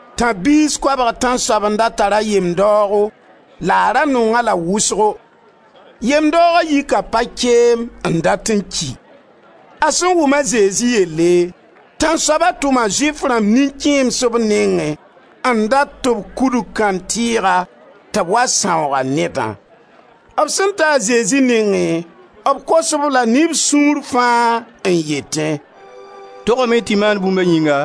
Tãb-biis koabg tãnsoab n da tar a yem-daoogo la a ra nong-a-la wʋsgo. Yem-daooga yika pa-keem n dat n ki. A sẽn wʋm a Zezi yelle, tãnsoaba tʋma Zʋɩf rãmb nin-kẽems b nengẽ n dat tɩ b kudg kãntɩɩga tɩ b wa sãoog a nedã. B sẽn ta a Zezi nengẽ, b kos-b la ne b sũur fãa n yetẽ: «Togame tɩ y maan bũmb a yĩnga,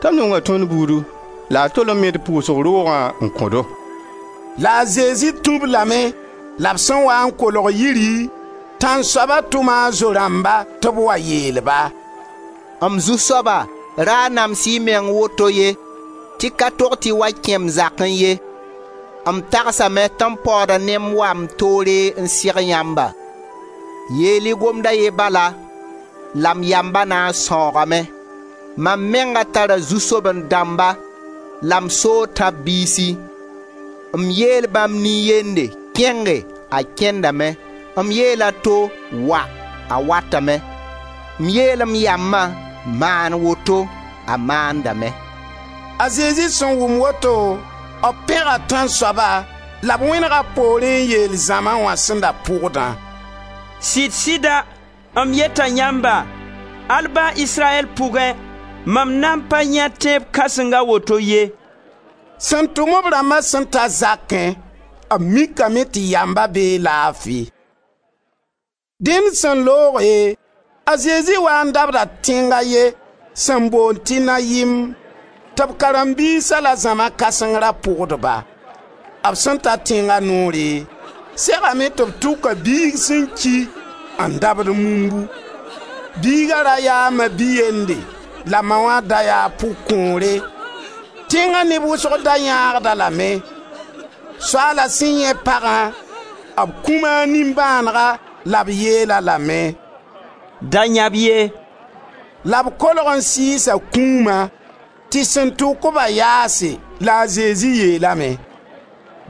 t'a nonga tõnd buudu la a tol n me d pʋʋsg roogã n kõ-do.» La a Zezi tũ-b lame la b sẽn waa n kolg yiri, tãnsoaba tʋma a zo-rãmba tɩ b wa yeel-ba: «M zu-soaba, ra nams-y y meng woto ye, tɩ ka tog tɩ y wa kẽ m zakẽ ye. M tagsame tɩ m paooda ne m wa m toore n seg yãmba. Yeel-y gomd a ye bala la m yamba na n sãoogame. Mam menga tara zu-soaben-dãmba la m soo tãb-biisi. M yeel bãmb nin-yende: Kẽnge, a kẽndame. M yeel a to: Wa! A watame. M yeel m yambã: Maan woto! A maandame.» A Zezi sẽn wʋm woto, b pẽga tãnsoaba la b wẽnega b poorẽ n yeel zãma wã sẽn da pʋgdã: «Sɩda m yeta yãmba, al ba Israyɛl pʋgẽ, mam nan pa yãe tẽeb kãseng a woto ye.» Sẽn tʋm b rãmba sẽn ta zakẽ b mikame tɩ yamba bee laafi. Dẽn sẽn looge, a Zezi waa n dabda tẽng a ye sẽn boond tɩ Nayim, tɩ b karen-biisa la zãma kãseng ra pʋgd-ba. B sẽn ta tẽnga noore, segame tɩ b tʋka biig sẽn ki n dabd mumbu; biiga ra yaa a ma-bi-yende la ma wã da yaa pʋg-kõore; tẽnga neb wʋsg da yãagd-a lame. Soaala sẽn yãe pagã, b kũma a nimbãanega la b yeel-a lame: «Da yãb ye!» La b kolg n sɩɩsa kũuma; tɩ sẽn tʋk-ba yaase la a Zezi yeelame: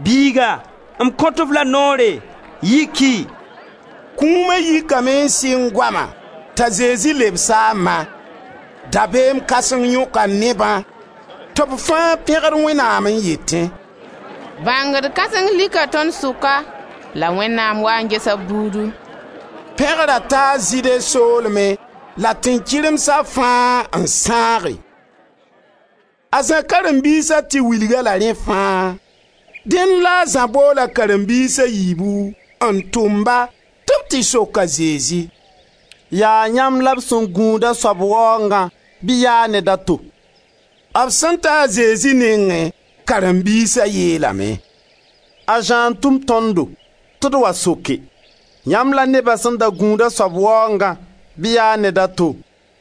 «Biiga m kõt-f la noore, yiki!» Kũuma yikame n sɩng goama t'a Zezi lebs-a a ma. Dabeem kãseng yõka nebã tɩ b fãa pẽgd Wẽnnaam n yetẽ: «Bãngd kãseng lika tõnd sʋka la Wẽnnaam waa n gesa b buudu.» Pẽgra taa Zɩɩde soolmẽ la tẽn-kɩremsa fãa n sãage. A Zã karen-biisa tɩ wilg-a-la rẽ fãa. Dẽnd la a Zã bool a karen-biis a yiibu n tʋʋm-ba tɩ b tɩ sok a Zezi: «Yaa yãmb la b sẽn da gũud a soab waoongã bɩ yaa ned a to?» B sẽn ta a Zezi nengẽ, karen-biisa yeelame: «A Zã n tʋm tõndo tɩ d wa soke: yãmb la neba sẽn da gũud a soab waoongã bɩ yaa ned a to?»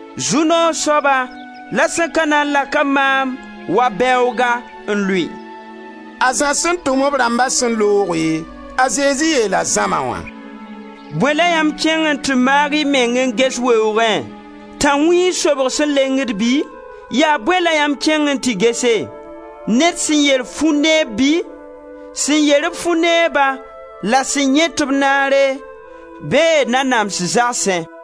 Zu-noog soaba la sẽn ka na n lak-a maam wa bɛooga n lʋɩ.» A Zã sẽn tʋm b rãmba sẽn looge, a Zezi yeela zãma wã: «Bõe la yãmb kẽng n tɩ maag y meng n ges weoogẽ? Tãnwĩig sobg sẽn lengd bɩ? Yaa bõe la yãmb kẽng n tɩ gese? Ned sẽn yer fʋ-neeb bi? Sẽn yer-b fʋ-neeba la sẽn yãet-b naare bee nanams zagsẽ.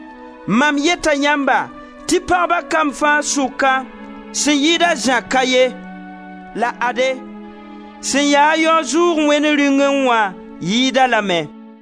Mam yeta yãmba tɩ pagba kamb fãa sʋka sẽn yɩɩd a Zã ka ye. La ade, sẽn yaa yao-zʋʋg Wẽnd Rĩungẽ wã yɩɩd-a lame.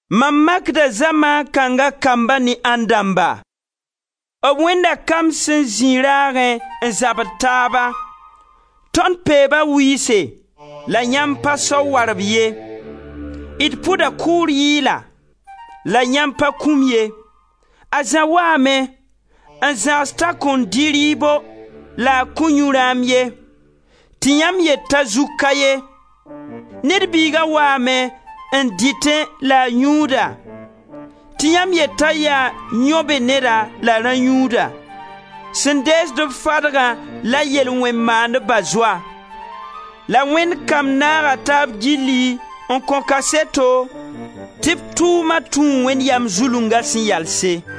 Mam makda zamaan kãnga kambã ne ãndãmba? B wẽnda kamb sẽn zĩ raagẽ n zabd taaba: ‹Tõnd peeba wɩɩse la yãmb pa sao warb ye, d pʋda kʋʋr yɩɩla la yãmb pa kũm ye.› A Zã waame n zãgs t'a kõn dɩ rɩɩbo la a kõn yu rãam ye tɩ yãmb yet t'a zug ka ye. Ned Biiga waame n dɩtẽ la a yũuda tɩ yãmb yet t'a yaa yão-be-neda la rã-yũuda, sẽn deesd-b fadgã la yel-wẽn-maandba zoa. La Wẽnd kamb naaga taab gilli n kõ kaseto tɩ tʋʋma tũu Wẽnd yam zulunga sẽn yalse.»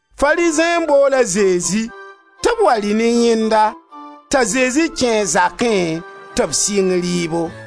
Farizẽ n bool a Zezi tɩ b wa rɩ ne yẽnda, t'a Zezi kẽ a zakẽ tɩ b sɩng rɩɩbo.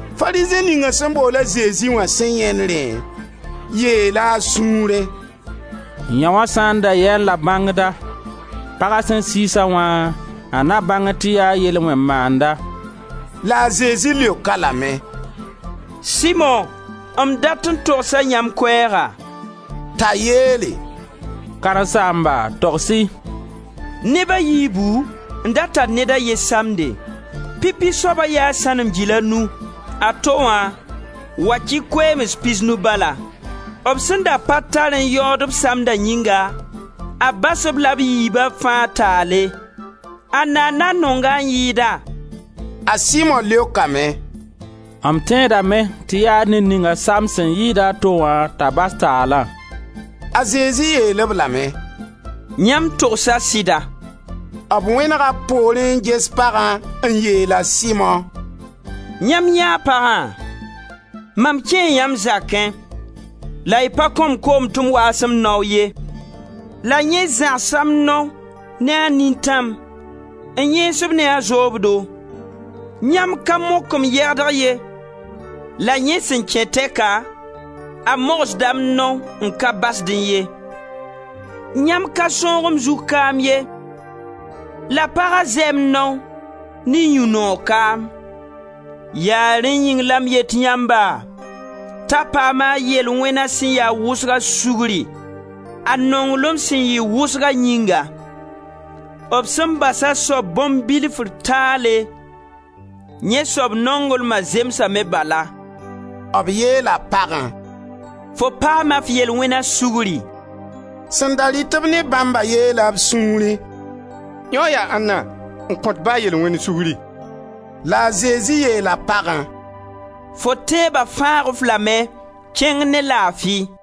Farizẽ ninga sẽn bool a Zezi wã sẽn yãend rẽ, yeela a sũurẽ: «Yãoo sã n da yaẽ-la bãngda, paga sẽn sɩɩs-a wã, a na bãngẽ tɩ yaa yel-wẽn-maanda.» La a Zezi leok-a lame: «Simo, m dat n togsa yãmb koɛɛga.» T'a yeele: «Karen-saamba, togs-y.» Neb a yiibu n da tar ned a ye samde: pipi soaba yaa sãnem gil a nu, a to wã wakɩ koeems pisnu bala. B sẽn da pa tar n yaood b samda yĩnga, a bas-b la b yiiba fãa taale. Anna n na n nong-a n yɩɩda? A Simo leokame: «M tẽedame tɩ yaa ned ninga samd sẽn yɩɩd a to wã t'a bas taalã.» A Zezi yeel-b lame: «Yãmb togsa sɩda.» B wẽnega b poorẽ n ges pagã n yeel a Simo: «Yãmb yãee pagã? Mam kẽe yãmb zakẽ la y pa kõn-m koom tɩ m waas m nao ye la yẽ zãgsa m nao ne a nintãm n yẽes-b ne a zoobdo. Yãmb ka mok m yɛgd ye, la yẽ sẽn kẽ tɛka a mogsda m nao n ka basdẽ ye. Yãmb ka sõog m zug kaam ye la paga zɛɛ m nao ne yũ-noog kaam. Yaa rẽ yĩng la m yet yãmba t'a paama a yel-wẽna sẽn ya wʋsga sugri, a nonglem sẽn yɩ wʋsga yĩnga. B sẽn bas a soab bõn-bilfr taale, yẽ soab nonglma zemsame bala.» B yeela pagã: «Fo paama f yel-wẽna sugri.» Sẽn da rɩt-b ne bãmba yeela b sũuri: «Yãoo yaa ãnna, n kõt ba yel-wẽnd sugri?» La a Zezi yeela pagã: «Fo tẽeba fãag-f lame, kẽng ne laafi.»